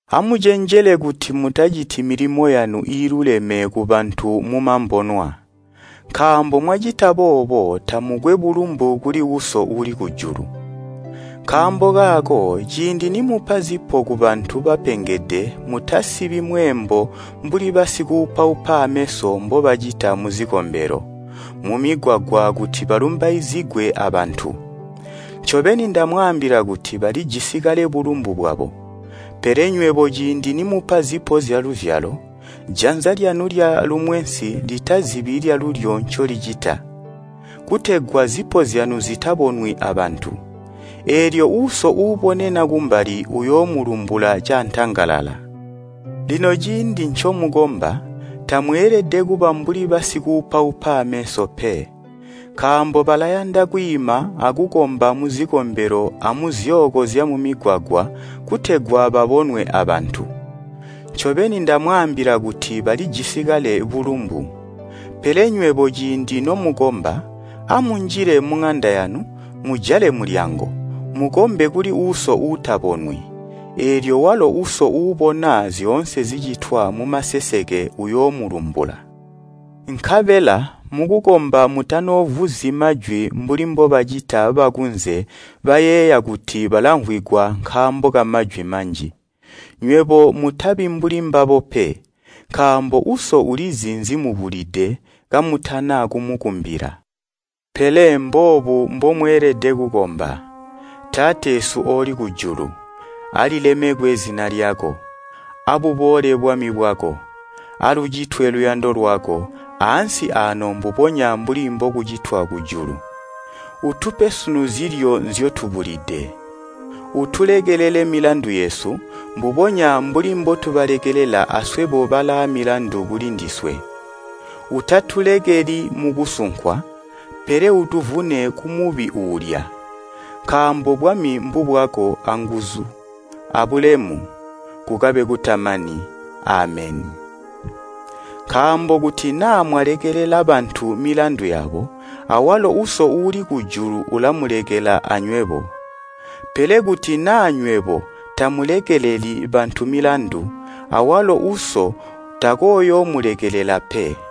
“Amucenjele kuti mutaciti milimo yanu iiluleme ku bantu mumambonwa, nkaambo mwacita boobo tamukwe bulumbu kuli Uso uuli kujulu. “Nkaambo kaako ciindi nimupa zipo kubantu bapengede mutasibi mweembo mbuli basikuupaupa aameso mbobacita muzikombelo, mumigwagwa kuti balumbaizigwe abantu. Ncobeni ndamwaambila kuti balijisi kale bulumbu bwabo. Pele nywebo ciindi nimupa zipo zyaluzyalo, janza lyanu lya lumwensi litazibi lyalulyo ncolicita, kutegwa zipo zyanu zitabonwi abantu. Eelyo Uso uubonena kumbali uyoomulumbula caantangalala. “Lino ciindi ncomukomba, tamweelede kuba mbuli basikuupaupa ameso pe, nkaambo balayanda kwiima akukomba muzikombelo amuzyooko zyamumigwagwa kutegwa babonwe abantu. Ncobeni ndamwaambila kuti balijisi kale bulumbu. Pele nywebo ciindi nomukomba, amunjile muŋanda yanu, mujale mulyango, mukombe kuli Uso Uutabonwi. Eelyo walo Uso uubona zyoonse zicitwa mumaseseke uyoomulumbula. “Nkabela mukukomba mutanoovuzyi majwi mbuli mbobacita bakunze bayeeya kuti balamvwigwa nkaambo kamajwi manji. Nywebo mutabi mbuli mbabo pe, nkaambo Uso ulizi nzimubulide kamutana kumukumbila. Pele mboobu mbomweelede kukomba: ‘Taateesu ooli kujulu, alilemekwe zina lyako. Abuboole bwami bwako, alucitwe luyando lwako ansi aano mbubonya mbuli mbolucitwa kujulu. Utupe sunu zilyo nzyotubula. Utulekelele milandu yesu, mbubonya mbuli mbotubalekelela aswebo balaamilandu kulindiswe. Utatulekeli mukusunkwa, pele utuvune kumubi uulya. Nkaambo bwami mbubwako anguzu abulemu, kukabe kutamani. Ameni.’ “Nkaambo kuti naa mwalekelela bantu milandu yabo, awalo Uso uuli kujulu ulamulekela anywebo. Pele kuti naa nywebo tamulekeleli bantu milandu, awalo Uso takooyoomulekelela pe.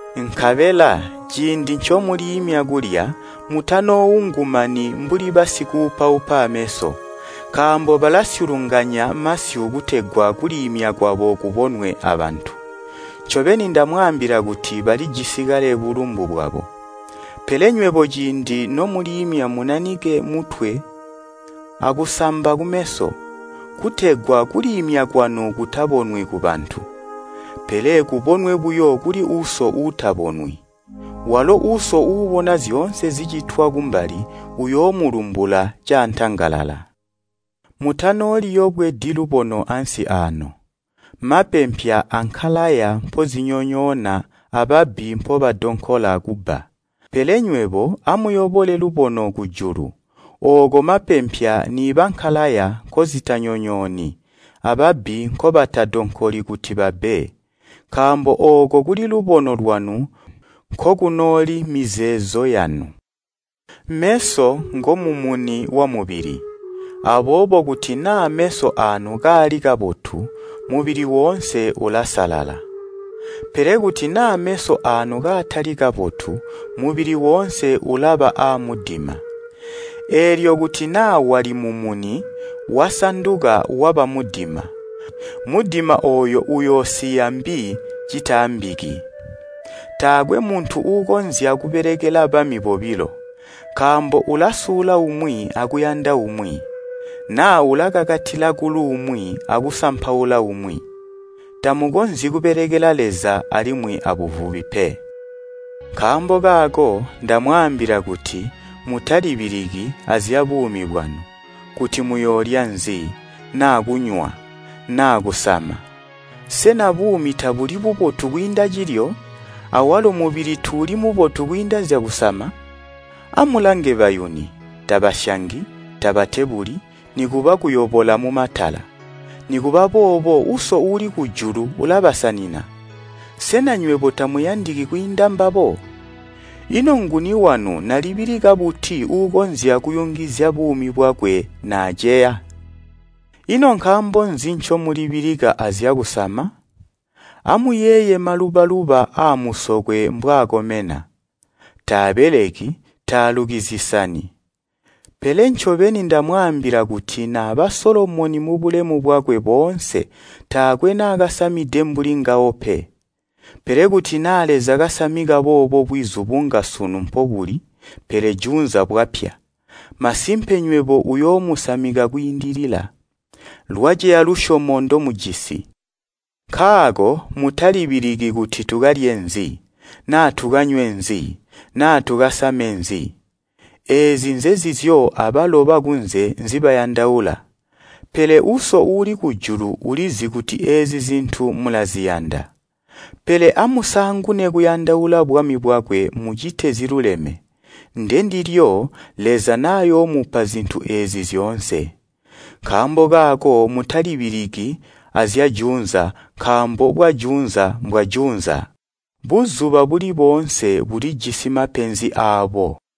“Nkabela ciindi ncomuliimya kulya, mutanooungumani mbuli basikuupaupa ameso. Nkaambo balasyulunganya masyu kutegwa kuliimya kwabo kubonwe abantu. Ncobeni ndamwaambila kuti balijisi kale bulumbu bwabo. Pele nywebo ciindi nomuliimya munanike mutwe akusamba kumeso, kutegwa kuliimya kwanu kutabonwi kubantu, pele kubonwe buyo kuli Uso uutabonwi. Walo Uso uubona zyoonse zicitwa kumbali uyoomulumbula caantangalala. “Mutanooliyobwedi lubono ansi aano, mapempya ankalaya mpozinyonyoona ababbi mpobadonkola kubba. Pele nywebo amuyobole lubono kujulu, ooko mapempya niiba nkalaya nkozitanyonyooni, ababbi nkobatadonkoli kuti babbe. Nkaambo ooko kuli lubono lwanu nkokunooli mizeezo yanu. “Meso ngomumuni wamubili, aboobo kuti naa meso aanu kaali kabotu mubili woonse ulasalala. Pele kuti naa meso aanu kaatali kabotu, mubili woonse ulaba aamudima. Eelyo kuti naa wali mumuni wasanduka waba mudima, mudima ooyo uyoosiya mbi citaambiki! “Taakwe muntu uukonzya kubelekela bami bobilo, nkaambo ulasula umwi akuyanda umwi, naa ulakakatila kuluumwi akusampaula umwi. Tamukonzyi kubelekela Leza alimwi abuvubi pe. “Nkaambo kaako ndamwaambila kuti mutalibiliki azyabuumi bwanu, kuti muyoolya nzi naa kunywa naa kusama. Sena buumi tabuli bubotu kwiinda cilyo, awalo mubili tuuli mubotu kwiinda zyakusama? Amulange bayuni, tabasyangi, tabatebuli, nikuba kuyobola mumatala. Nikuba boobo Uso uuli kujulu ulabasanina. Sena nywebo tamuyandiki kwiinda mbabo? Ino nguni wanu nalibilika buti uukonzya kuyungizya buumi bwakwe naaceya? “Ino nkaambo nzi ncomulibilika azyakusama? Amuyeeye maluba-luba aamusokwe mbwaakomena. Taabeleki, taaluki zisani. Pele ncobeni ndamwaambila kuti naba Solomoni mubulemu bwakwe boonse taakwe naakasamide mbuli ngawo pe. Pele kuti naa Leza kasamika boobo bwizu bunga sunu mpobuli pele juunza bwapya, masimpe nywebo uyoomusamika kwiindilila. Lwaceya lusyomo ndomujisi! Nkaako mutalibiliki kuti tukalye nzi, naa tukanywe nzi naa tukasame nzi? Eezi nzenzizyo abalo bakunze nzibayandaula, pele Uso uuli kujulu ulizi kuti eezi zintu mulaziyanda. Pele amusaangune kuyandaula bwami bwakwe mucite ziluleme, ndindilyo, Leza nayoomupa zintu eezi zyoonse. Nkaambo kaako mutalibiliki azyajuunza nkaambo bwajuunza mbwajuunza. Buzuba buli boonse bulijisi mapenzi aabo.